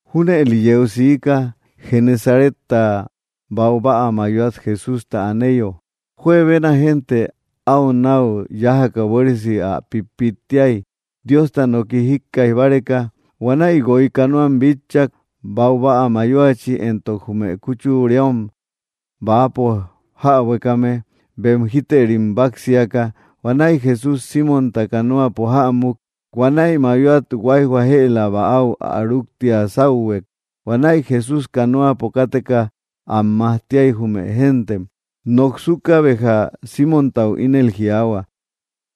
Júnëli yeu siika: Genesaretta baubäa mayoat Jesústa aneyo, juebena génte áu náu yájaka buéresi ä pítpittiay, Diosta noki jíkkaij báreka. Huanäi guoy canoam bitchak, baubäa mayoachi, éntok jume kúchureom bäapo jäbuekame, bem jítërim báksiaka. Huanäi Jesús, Símonta canoapo jämuk. Huanäi mayoat huáijhua jëla bäau ä rúktia sáuhuek. Huanäi Jesús canoapo káteka am majtiay jume géntem. Noksuka béja, Símontau ínel jiaahua: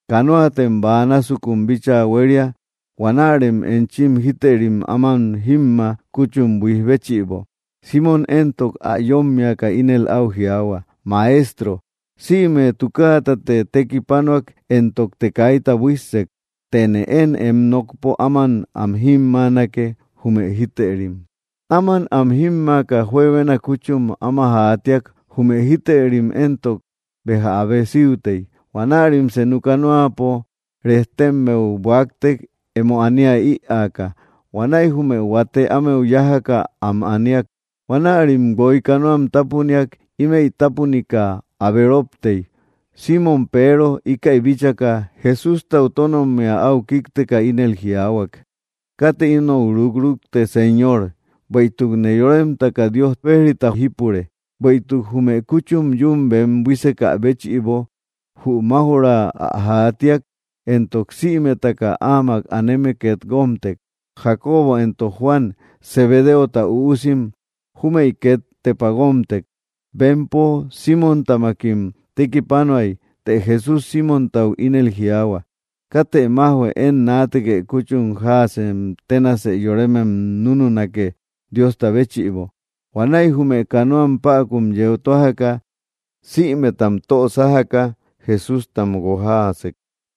—Canoatem bäa násukun bíchaa huéria. Huanärem enchim jítërim áman jímma kúchum buíj béchïbo. Símon éntok ä yómmiaka, ínel áu jiaahua: —Maestro, sïme tukaatate tekipanuak éntokte kaita buíssek; tëne én em nokpo áman am jímmanake jume jítërim. Áman am jímmaaka, juebena kúchum áma jaatiak jume jítërim éntok béja abe síutey. Huanärim senu canoapo rejtemmeu buáktek, emo ania ïaaka. Huanäi jume huate ámeu yájaka, am aniak. Huanärim guoy canoam tápuniak ímëi tapunika abe róptey. Símon Peero, íkäi bíchaka, Jesústau tónommia áu kíkteka, ínel jiaahuak: —¡Katë inou rukrukte, Señor! Bueïtukne yóremtaka Dios bejrita jípure. Bueïtuk jume kúchum yún bem buísekä béchïbo, jü máuj‑ra ä jaatiak, éntok sïmetaka áamak aneme két guómtek. Jacobo éntok Juan, Zebedeota üusim, júmëi két tepa guómtek. Bempo Símontamakim tekipanuay. Të Jesús Símontau ínel jiaahua: —Katë májhue; én naatekë kúchu jaasem tenasë yoremem nununake Diosta béchïbo. Huanäi jume canoam päkun yeu tójaka, sïmetam tö sájaka, Jesústam guojaasek.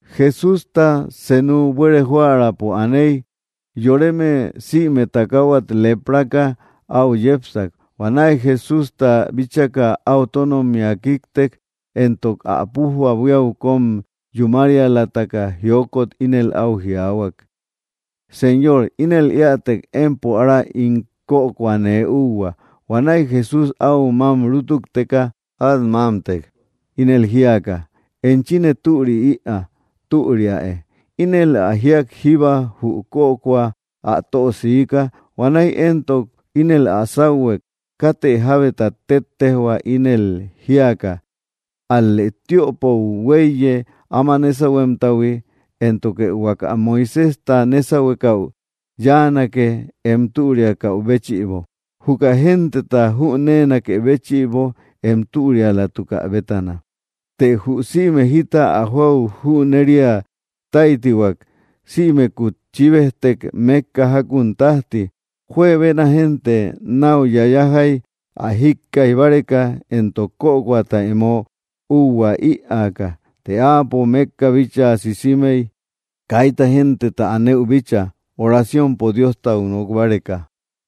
Jesústa senu buere joärapo aney, yoreme sïme takahuat leprapaka áu yepsak. Huanäi Jesústa bíchaka, áu tónommia kíktek, éntok ä pújba buíau kóm yúmarialataka jiokot ínel áu jiaahuak: —Señor, ínel éätek, empo ára ín kökoa nee úhua. Huanäi Jesús áu mám rútukteka át mámtek, ínel jíaka: —Enchine türi ïaa. Türiäe. Ínel ä jíak, jíba jü kökoa ä tö siika. Huanäi éntok ínel ä sáuhuek katë jábeta téttejhua. Ínel jiaka: —Ál‑lë tiöpou huéiye áma nésahuemtahui, éntoke huaka Moiséjta nésahuekäu yáanake em türiakäu béchïbo, juka genteta jüneenakë béchïbo em türialatukä bétana. Të jü sïme jita ä joäu jüneria táytihuak, sïmekut chíbejtek mékka jákun tájti. Juebena génte náu yayajay ä jíkkaij báreka, éntok kökoata emo úhua ïaaka. Të áapo mékka bíchaa sisimey, kaita genteta anëu bíchaa, orciompo Diostau nok báreka.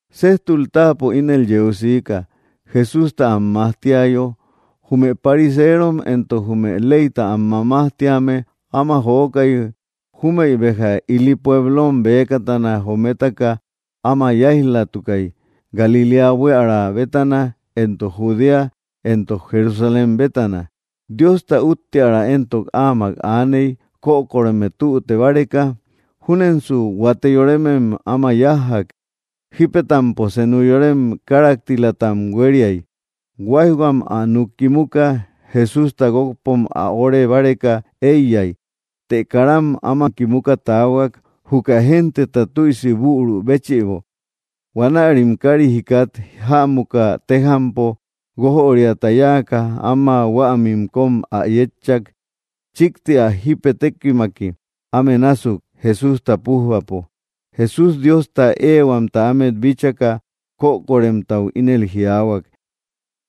Séjtul táapo ínel yeu siika Jesústa am majtiayo, jume pariseerom éntok jume leyta am mamajtíame áma jokay júmëi béja ili pueblom bëkatana jometaka áma yáij‑latukay, Galiléa buiära bétana éntok Judea éntok Jerusalén bétana; Diosta úttiära éntok áamak aaney kökoreme tüte báreka. Júnensu huate yoremem áma yájjak, jípetampo senu yorem káraktilatam huériay, huáijhuam ä núk kimuka, Jesústa guókpom ä óre báreka éiyay. Të karam áma kimuka taahuak, juka genteta tüisi büru béchïbo. Huanärim kári jikat jämuka, tejampo guójöriata yáaka, áma huämim kóm ä yétchak, chíkti ä jípetekimaki, áme násuk, Jesústa pújbapo. Jesús, Diostat ehuamta ámet bíchaka, kokoremtau ínel jiaahuak: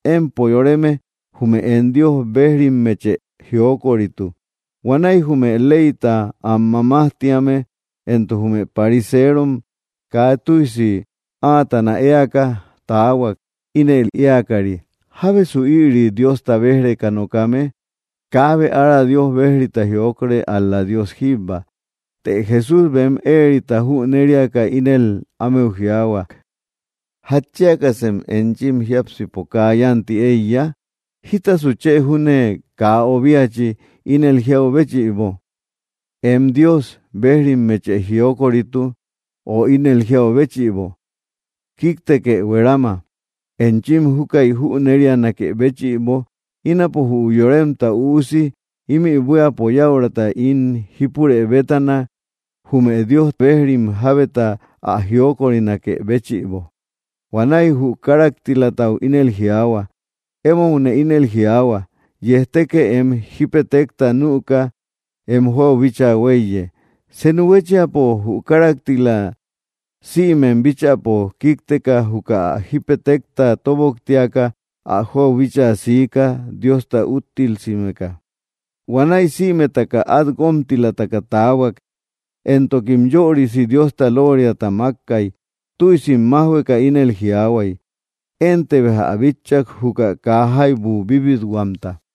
—Empo yoreme, jume em Dios bejrimmeche jiokoritu. Huanäi jume leyta am mamajtíame éntok jume pariseerom kaa tüisi áatana éaka taahuak, ínel éakari: “¿Jábesa ïri Diosta béj‑reka nokame? Kaabe ára Dios bejrita jiokore, ál‑la Dios jíbba.” Të Jesús bem éerita jüneriaka, ínel ámeu jiaahuak: —¿Jatchiakasem enchim jiápsipo kaa yánti éiya? ¿Jítasu chë júne kaa obiachi, ínel jiau béchïbo: “Em Dios bejrimeche jiokorituk”, o ínel jiau béchïbo: “Kíktekë, huerama”? Enchim júkäi jünerianakë béchïbo, ínapo jü Yoremta Üusi ímï buíapo yäurata ín jípurë bétana jume Dios bejrim jábeta ä jiokorinakë béchïbo. Huanäi jü káraktilatau ínel jiaahua: —Emoune ínel jiaahua, yejtekë em jípetekta nüka em jóau bíchaa huéiye. Senu huéchiapo, jü káraktila, sïmem bíchäpo kíkteka, juka ä jípetekta tóboktiaka, ä jóau bíchaa siika Diosta úttilsimeka. Huanäi sïmetaka át guómtilataka taahuak, éntokim yörisi Diosta looriata makkay, tüisim májhueka, ínel jiaahuay: —Énte bejja ä bitchak juka kaa jaibu bíbithuamta.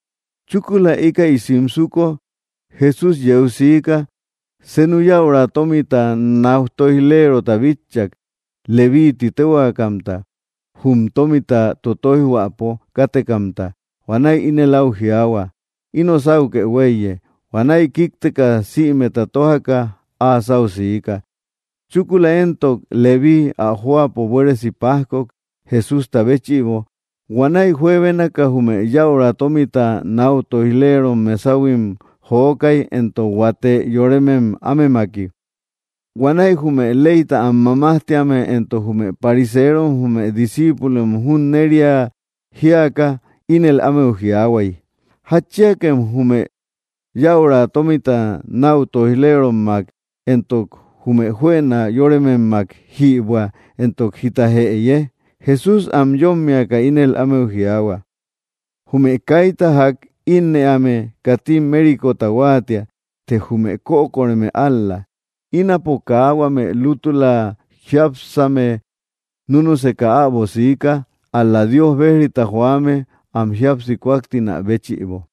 Chúkula íkäi simsuko Jesús yeu siika, senu yäura tómita náu tóij‑lerota bitchak, Levíi tï téhuakamta, jum tómita tótoijhuäpo kátekamta. Huanäi ínel áu jiaahuak: —Ino sauke huéiye. Huanäi kíkteka, sïmeta tójaka, áa sáu siika. Chúkula éntok, Levíii ä jóapo buéresi pajkok, Jesústa béchïbo, huanäi juebénaka jume yäura tómita náu tóij‑leerom mesahuim jokay, éntok huate yoremem ámemaki. Huanäi jume leyta am mamajtíame éntok jume pariseerom jume discíipulom junneria jíaka, ínel ámeu jiaahuay: —¿Jatchiakem jume yäura tómita náu tóij‑lerommak éntok jume juëna yorememmak jïbuä, éntok jita jëye? Jesús am yómmiaka, ínel ámeu jiaahua: —Jume kaita ják ínnëame katim mérikota huáatia, të jume kökoreme ál‑la. Ínapo kaa huame lútüla jiápsame núnuseka äbo siika, ál‑la Dios bejrita joame, am jíapsi kúaktinä béchïbo.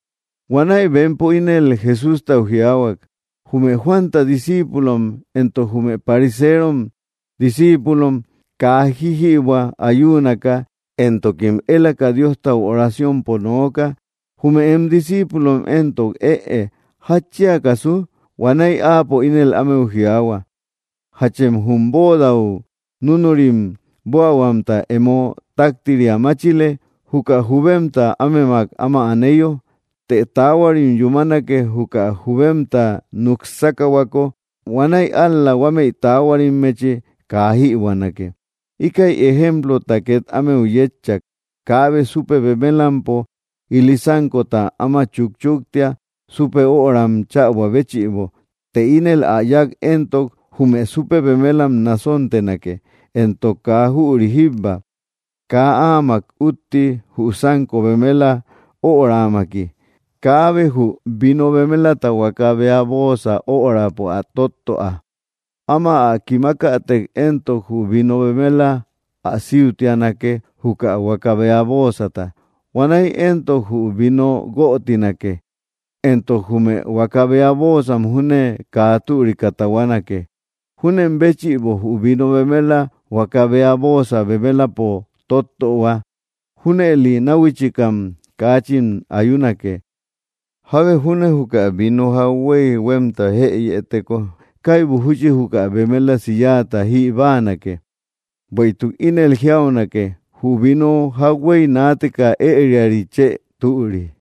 Huanäi bempo ínel Jesústau jiaahuak: —¿Jume Juanta discíipulom éntok jume pariseerom discíipulom kaa jíjïbuä ayuunaka éntokim élaka Diostau oraciompo nooka, jume em discíipulom éntok ëe? ¿Jatchiakasu? Huanäi áapo ínel ámeu jiaahua: —¿Jachem jum bóodau núnurim buähuamta emo táktiria máchile, juka jubemta ámemak áma aneyo? Të taahuarim yúmanake, juka jubemta núk sákahuako. Huanäi ál‑la huamei taahuarimmechim kaa jïbuänake. Íkäi ejemplota két ámeu yétchak: —Kaabe súpe bemelampo ili sánkota áma chúkchuktia, súpe öram chäbuä béchïbo. Të ínel ä yák éntok, jume súpe bemelam nasontenake, éntok kaa jüri jíbba, kaa áamak útti jü sánko bemela öramaki. Kaabe jü vino bemelata huaka bea bóosa örapo ä tóttöa. Áma ä kimakätek éntok, jü vino bemela ä síutianake juka huaka bea bóosata. Huanäi éntok, jü vino guötinake, éntok jume huaka bea bóosa júne kaa türika tahuanake. Júnen béchïbo, jü vino bemela huaka bea bóosa bemelapo tottöhua. Júnëli náhuichikam kaachin ayunake. Jábe júne juka vino jauhuey huémta jëyëteko, kaibu júchi juka bemelasi yáata jï báanake. Bueïtuk ínel jiaunake: “Jü vino jauhuey naateka ëriari chë türi.”